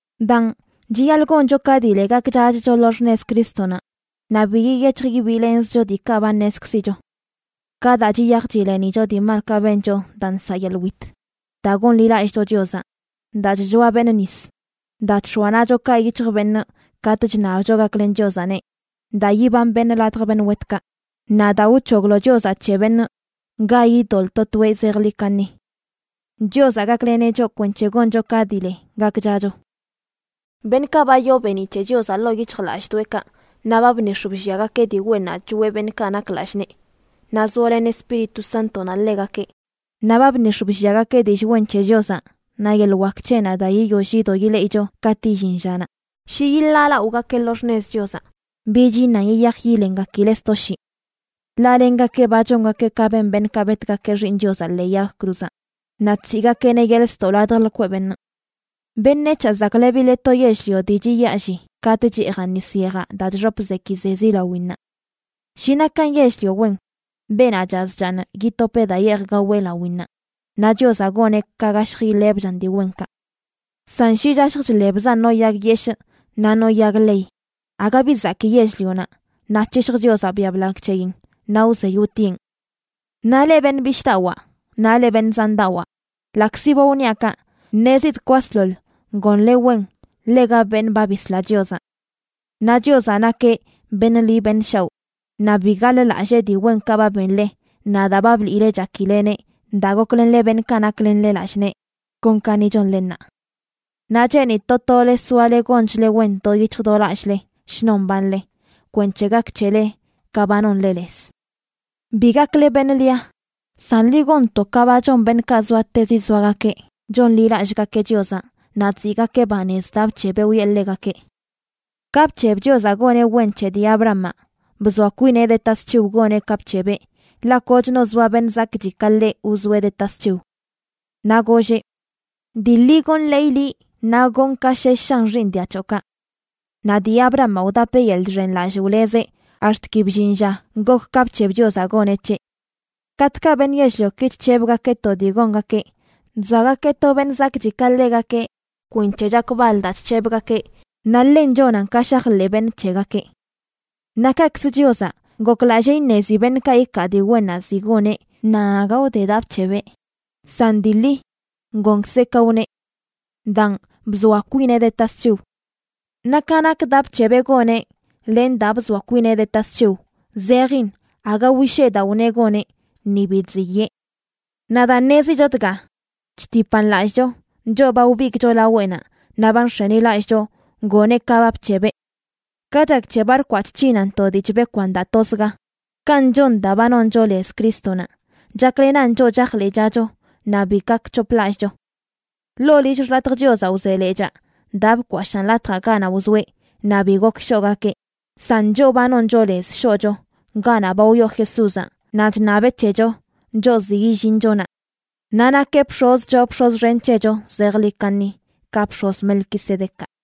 Daan, chiyaḻꞌ goncho ka dii le gakchachcho lo xṉez Crístonaꞌ, naꞌ bi yiyec̱hj yibiilenzcho diikaꞌ ba ṉezkzicho: ka daa chiyaj chilenicho dii malkaꞌ bencho daa nsaꞌ yeḻꞌ wit, daa gonḻilallꞌcho Chiozaꞌ, daa chchoa beṉꞌ nis, daa chx̱oa naꞌchokaꞌ yic̱hj beṉꞌ katꞌ chṉabcho gaklen Chiozaꞌneꞌ, daa yiban beṉꞌ ladj beṉꞌ wetkaꞌ, naꞌ daa wc̱hoglo Chiozaꞌ c̱he beṉꞌ ga idoḻꞌ to toeꞌ zejḻi kaṉi. Chiozaꞌ gakleneꞌ choꞌ kwenc̱he goncho ka dii le gakchacho. Beṉꞌkaꞌ ba yoo beeniꞌ c̱he Chiozaꞌ ḻoo yic̱hjlallꞌdoꞌekaꞌ, naꞌ ba bnix̱ blliagakeꞌ dii wennaꞌ choꞌe beṉꞌkaꞌ nak lallꞌ nee, naꞌ zoalen Espíritu Sántonaꞌ ḻegakeꞌ, naꞌ ba bnix̱ blliagakeꞌ dillꞌ wen c̱he Chiozaꞌ naꞌ yeḻꞌ wak c̱heꞌnaꞌ daa yiyoll yido ileꞌicho katꞌ illin llanaꞌ, shi yiḻaalaꞌogakeꞌ lo xṉez Chiozaꞌ, bich iṉan yiyaj yilengakileꞌ sto shii. Ḻaꞌ lengakeꞌ ba chongakeꞌ ka ben beṉꞌkaꞌ betgakeꞌ Xiiṉ Chiozaꞌ ḻee yag cruzaꞌ naꞌ chsiꞌgakeꞌneꞌ yeḻꞌ ztoꞌ ladj lkweꞌ beṉꞌ. Beṉec̱haꞌ zaklebileꞌ to yell-lio dii chiyaalli katꞌ cheejan nis yejaꞌ daa chxop zekizezi lawinnaꞌ. Shi nakan yell-lio wen, beenaꞌ chaz chaaṉ yitopeꞌ daa yeej gaweꞌ lawinnaꞌ, naꞌ Chiozaꞌ goneꞌ ka gashj iḻebchan dii wenkaꞌ. San shi chashj chḻebzan no yag yeshꞌ naꞌ no yag ḻey, aga bi zakii yell-lionaꞌ naꞌ c̱hishj Chiozaꞌ biaꞌ blagꞌ c̱heyin naꞌ wzey wtieꞌn. Naꞌ leꞌ beṉꞌ bishꞌdawaa naꞌ leꞌ beṉꞌ zandawaa, ḻaꞌkzi ba wniaꞌ kaꞌ, ṉezidꞌ kwasḻoḻ gonle wen ḻega beṉꞌ ba bisla Chiozaꞌ. Naꞌ Chiozaꞌ nakeꞌ beṉꞌ ḻi beṉꞌ shaoꞌ, naꞌ bi gaḻ-lallee dii wenkaꞌ ba benle naꞌ daa ba bliꞌle chakileneꞌ daa goklenle beṉꞌkaꞌ naklenle lallꞌ nee, kon ka ni chonle ṉaa. Naꞌ cheenidꞌ to tole soale gonchle wen do yic̱hj do lallꞌle shnon mbanle, kwenc̱he gak c̱hele ka ba nonle lez. Bi gakle beṉꞌ lia, san ḻi gonto ka ba chon beṉꞌkaꞌ zoatezi zoagakeꞌ chonḻilallꞌgakeꞌ Chiozaꞌ naꞌ chziꞌgakeꞌ banez daa bc̱hebeꞌ wiꞌe ḻegakeꞌ. Ka bc̱heb Chiozaꞌ goneꞌ wen c̱he dii Abrahamaꞌ, bzoa kwineꞌ de tasc̱hiw goneꞌ ka bc̱hebeꞌ, ḻaꞌ koch no zoa beṉꞌ zakꞌchi ka ḻeꞌ wzoeꞌ de tasc̱hiw. Naꞌ golleꞌ: “Dii ḻi gonḻeeyꞌ liꞌ naꞌ gonꞌ ka shesh shan xiiṉ dia c̱hoꞌkaꞌ.” Naꞌ dii Abrahamaꞌ wdapeꞌ yeḻꞌ chxenlallꞌ wlezeꞌ ax̱t ki bllin lla gok ka bc̱heb Chiozaꞌ goneꞌ c̱heꞌ. Katꞌkaꞌ beṉꞌ yell-lioki chc̱hebgakeꞌ to dii gongakeꞌ, chzoagakeꞌ to beṉꞌ zakꞌchi ka ḻegakeꞌ kwenc̱he chakbal daa chc̱hebgakeꞌ, naꞌ ḻen chonan ka shajḻeꞌ beṉꞌ c̱hegakeꞌ. Naꞌ kaꞌkzə Chiozaꞌ, goklallee iṉezi beṉꞌkaꞌ ikaa dii wennaꞌ ziꞌ goneꞌ nan aga wde daa bc̱hebeꞌ, san dii ḻi, gonkzeꞌ ka wneꞌ. Daan, bzoa kwineꞌ de tasc̱hiw. Naꞌ ka nak daa bc̱hebeꞌ goneꞌ len daa bzoa kwineꞌ de tasc̱hiw zejin aga wishee daa wneꞌ goneꞌ, ni bi chziyee. Naꞌ daa ṉezicho dga, chtipan lallꞌcho, choꞌ ba wbigꞌcho laweꞌnaꞌ naꞌ ba nx̱enilallꞌcho goneꞌ ka ba bc̱hebeꞌ. Ka chak c̱he barkwaꞌ chc̱hinan to dii chbekwan daa tozga, kanꞌ chon daa ba noncho lez Crístonaꞌ, chaklenan choꞌ chajḻeꞌchacho naꞌ bi gak c̱hoplallꞌcho. Ḻoo lill xḻatj Chiozaꞌ wze lechaa daa bkwashaan latjaꞌ ganaꞌ wzoeꞌ naꞌ bi gok shoꞌgakeꞌ, san choꞌ ba noncho lez shoꞌcho ganaꞌ ba wyoo Jesúzaꞌ naꞌ chṉabeꞌ c̱hecho, choꞌ ziꞌ yillincho naꞌ. Naꞌ nakeꞌ bx̱oz choo bx̱oz xen c̱hecho zejḻi kaṉi ka bx̱oz Melquisedecaꞌ.